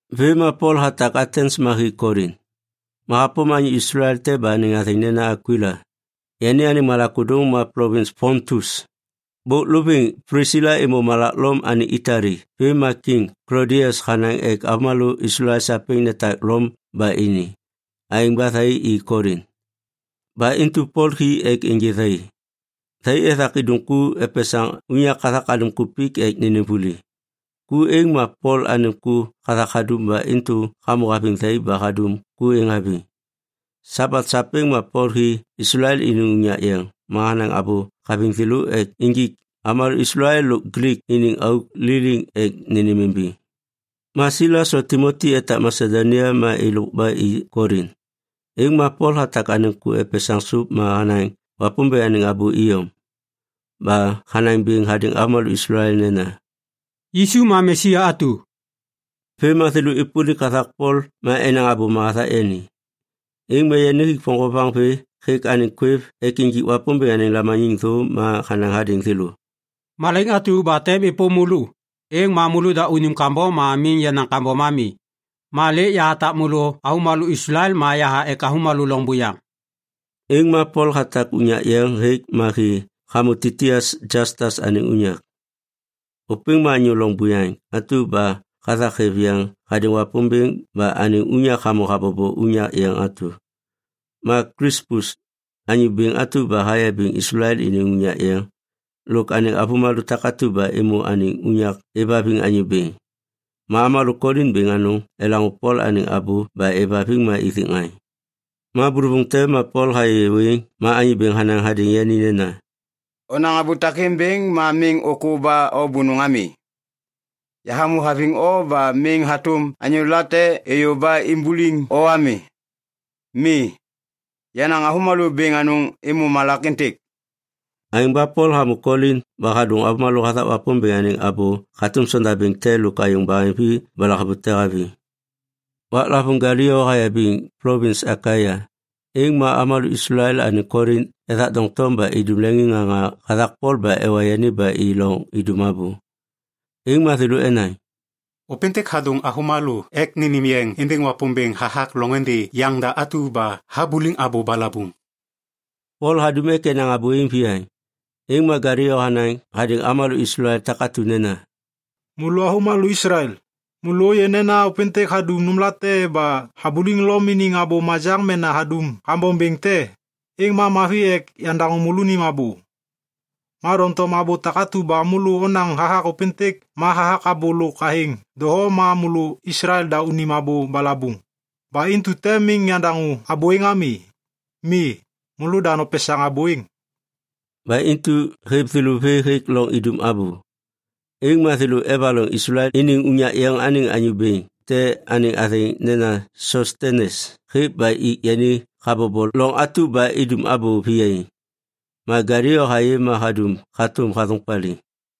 Vêm ma Pol hatak Atens ma hi Kolin. Ma hapôm anyô Islael te ba anêŋ athêŋ nena Akwila. Yani anêŋ malak ôdôŋ ma plovins Pontus. Bôk lovêŋ Plisila êmô malak Lom anêŋ Itali vêm ma Kiŋ Klodias hanaŋ ek avômalô Islael sapêŋ netak Lom ba ini. Aêŋ ba thai i Kolin. Ba intu Pol hi ek ênjê thai. Thai ethak idum ku epesaŋ unyak hathak alim kupik ek nênêm vuli. Ku êŋ ma Pol anêŋ ku hathak hadum ba intu hamô haviŋ thai ba hadum ku êŋ haviŋ. Sabat sapêŋ ma Pol hi Islael iniŋ unyak yeŋ ma hanaŋ abô haviŋ thêlô ek injik avômalô Islael lôk Glik iniŋ auk liliŋ ek nênêmimbiŋ. Ma Silas lo Timoti etak Masedonia ma êlôk ba i Kolin, êŋ ma Pol hatak anêŋ ku epesaŋ sôp ma hanaŋ Wapômbêŋ anêŋ abô iyom. Ba hanaŋ bêŋ hadêŋ avômalô Islael nena, “Yisu ma Mesia atu.” Vêm ma thêlô êpôlik hathak Pol ma enaŋ abôma hathak yani. Êŋ ma yani hik voŋgovaŋ vê hêk anêŋ kwêv ek injik Wapômbêŋ anêŋ lamaniŋ thô ma hanaŋ hadêŋ thêlô, “Malaiŋ atu ba tem êpôm môlô, êŋ ma môlôda unim kambom ma miŋ yenaŋ kambom ami. Ma lêk yahatak môlô avômalô Islael ma yaha ek avômalô loŋ buyaŋ.” Êŋ ma Pol hatak unyak yeŋ hêk ma hi hamô Titius Jastas anêŋ unyak. Ôpêŋ ma anyô loŋ buyaŋ atu ba hathak hêv yeŋ hadêŋ Wapômbêŋ ba anêŋ unyak hamô habobo unyak yeŋ atu. Ma Klispus, anyô bêŋ atu ba hayabiŋ Islael iniŋ unyak yeŋ, lôk anêŋ avômalô takatu ba êmô anêŋ unyak êvhaviŋ Anyô Bêŋ. Ma avômalô Kolin bêŋ anôŋ elaŋô Pol anêŋ abô ba êvhaviŋ ma ithik ŋaŋ. Ma bôlôvôŋ te ma Pol hayê wêŋ ma Anyô Bêŋ hanaŋ hadêŋ yani nena, “Onaŋ abô takêŋ bêŋ ma miŋ ôkô ba o bônôŋ ami. Yahamô haviŋ o ba miŋ hatôm anyô late êyô ba imbuliŋ o ami. Mi, yenaŋ avômalô bêŋ anôŋ êmô malak êntêk.” Aêŋ ba Pol hamô Kolin ba hadôŋ avômalô hathak Wapômbêŋ anêŋ abô hatôm sondabêŋ te lôk ayôŋ baheŋvi ba lahavute haviŋ. Waklavôŋ Galio hayabiŋ plovins Akaia, êŋ ma avômalô Islael anêŋ Kolin ethak doŋtom ba idum leŋiŋŋaŋa hathak Pol ba ewa yani ba i loŋ idum abô. Êŋ ma thêlô enaŋ, “Ôpêntêk hadôŋ avômalô ek nênêm yeŋ êndêŋ Wapômbêŋ hathak loŋôndê yaŋda atu ba habuliŋ abô balabuŋ.” Pol hadum ek enaŋ abô êŋ viyaŋ, êŋ ma Galio hanaŋ hadêŋ avômalô Islael takatu nena, “Môlô avômalô Islael, môlô ôyê nena ôpêntêk hadum nômlate ba habuliŋ Lom iniŋ abô majaŋ mena hadum kambom bêŋ te, êŋ ma mavi ek yandaŋô môlônim abô. Ma doŋtom abô takatu ba môlô onaŋ hathak ôpêntêk ma hathak abô lôk athêŋ doho ma môlô Islael da unim abô balabuŋ. Ba intu tem miŋ yandaŋô abô êŋ ami. Mi, môlôda nopesaŋ abô êŋ.” Ba intu hêv thêlô vê hêk loŋ idum abô. Êŋ ma thêlô evaloŋ Islael iniŋ unyak yeŋ anêŋ anyô bêŋ te anêŋ athêŋ nena Sostenes hêk ba ik yani habobo loŋ atu ba idum abô viyaiŋ. Ma Galio hayê ma hadum hatôm hathôŋ paliŋ.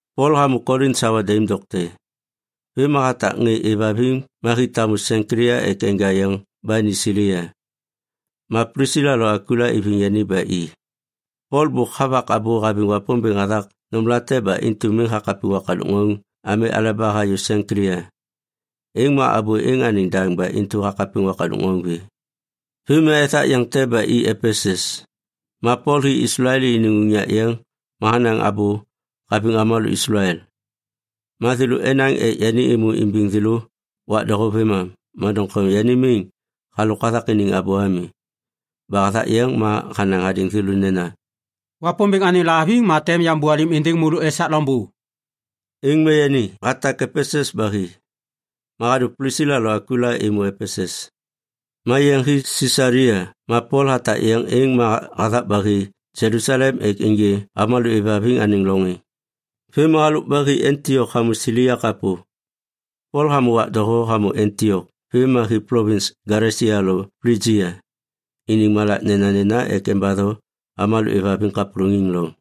Pol hamô Kolin sawa daim dokte. Vêm ma hatak ŋê êvhaviŋ ma hi tamu Senklia ek enja yeŋ ba ni Silia. Ma Plisila lo Akwila iviŋ yani ba i. Pol bôk havak abô haviŋ Wapômbêŋ hathak nômlate ba intu miŋ hakapiŋ wakadôk ŋauŋ ami aleba hayô Senklia. Êŋ ma abô êŋ anêŋ daŋ ba intu hakapiŋ wakadôk ŋauŋ vê. Vêm ma ethak yeŋ te ba i Epesus. Ma Pol hi Islael iniŋ unyak yeŋ ma hanaŋ abô haviŋ avômalô Islael. Ma thêlô enaŋ ek yani êmô imbiŋ thêlô wak doho vêmam, ma doŋtom yani miŋ halôk hathak iniŋ abô ami. Ba hathak yeŋ ma hanaŋ hadêŋ thêlô nena, “Wapômbêŋ anêŋ lahaviŋ ma tem yambôalêm êndêŋ môlô esak loŋbô.” Êŋ ma yani hatak Epesus ba hi. Ma hadô Plisila lo Akwila êmô Epesus. Ma yeŋ hi Sisalia ma Pol hatak yeŋ êŋ ma hathak ba hi Jelusalem ek ênjê avômalô êvhaviŋ anêŋ loŋ êŋ. Vêm ma halôk ba hi Antiok hamô Silia kapô. Pol hamô wak doho hamô Antiok vêm ma hi plovins Galesia lo Plijia iniŋ malak nenanena ek embatho avômalô êvhaviŋ kapôlôŋiŋ loŋ.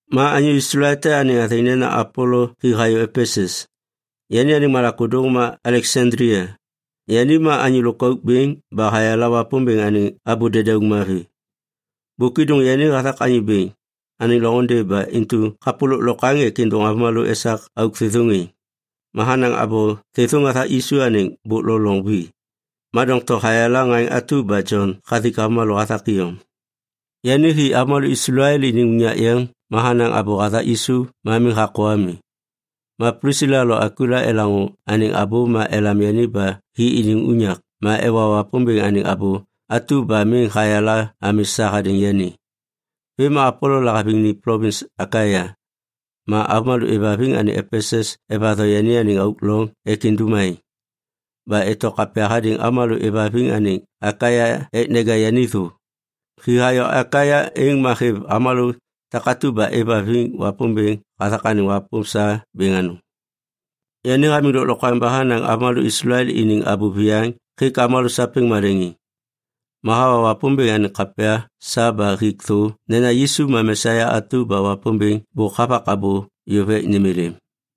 Ma anyô Islael te anêŋ athêŋ nena Apolo hi hayô Epesus. Yani anêŋ malak ôdôŋ ma Aleksandlia. Yani ma anyô lôkauk bêŋ ba hayala Wapômbêŋ anêŋ abô dedauŋ mavi. Bôk êdôŋ yani hathak Anyô Bêŋ anêŋ loŋôndê ba intu kapô lôklokwaŋ ek êdôŋ avômalô esak auk thêthôŋ êŋ. Ma hanaŋ abô thêthôŋ hathak Yisu anêŋ bôk lo loŋ vi. Ma doŋtom hayala ŋaŋ atu ba Jon hathik avômalô hathak iyom. Yani hi avômalô Islael iniŋ unyak yeŋ ma hanaŋ abô hathak Yisu ma miŋ hakô ami. Ba Plisila lo Akwila elaŋô anêŋ abô ma elam yani ba hi iniŋ unyak ma ewa Wapômbêŋ anêŋ abô atu ba miŋ hayala ami sa hadêŋ yani. Vêm ma Apolo lahaviŋ ni plovins Akaia, ma avômalô êvhaviŋ anêŋ Epesus evatho yani anêŋ auk loŋ ek indum aêŋ. Ba eto kapya hadêŋ avômalô êvhaviŋ anêŋ Akaia ek neja yani thô. Hi hayô Akaia, êŋ ma hêv avômalô takatu ba êvhaviŋ Wapômbêŋ hathak anêŋ wapôm sa bêŋ anôŋ. Yani hamiŋ lôklokwaŋ ba hanaŋ avômalô Islael iniŋ abô viyaŋ hêk avômalô sapêŋ maleŋiŋ. Ma hawa Wapômbêŋ anêŋ kapya sa ba hik thô nena Yisu ma Mesia atu ba Wapômbêŋ bôk havak abô yôv ek nêm êlêm.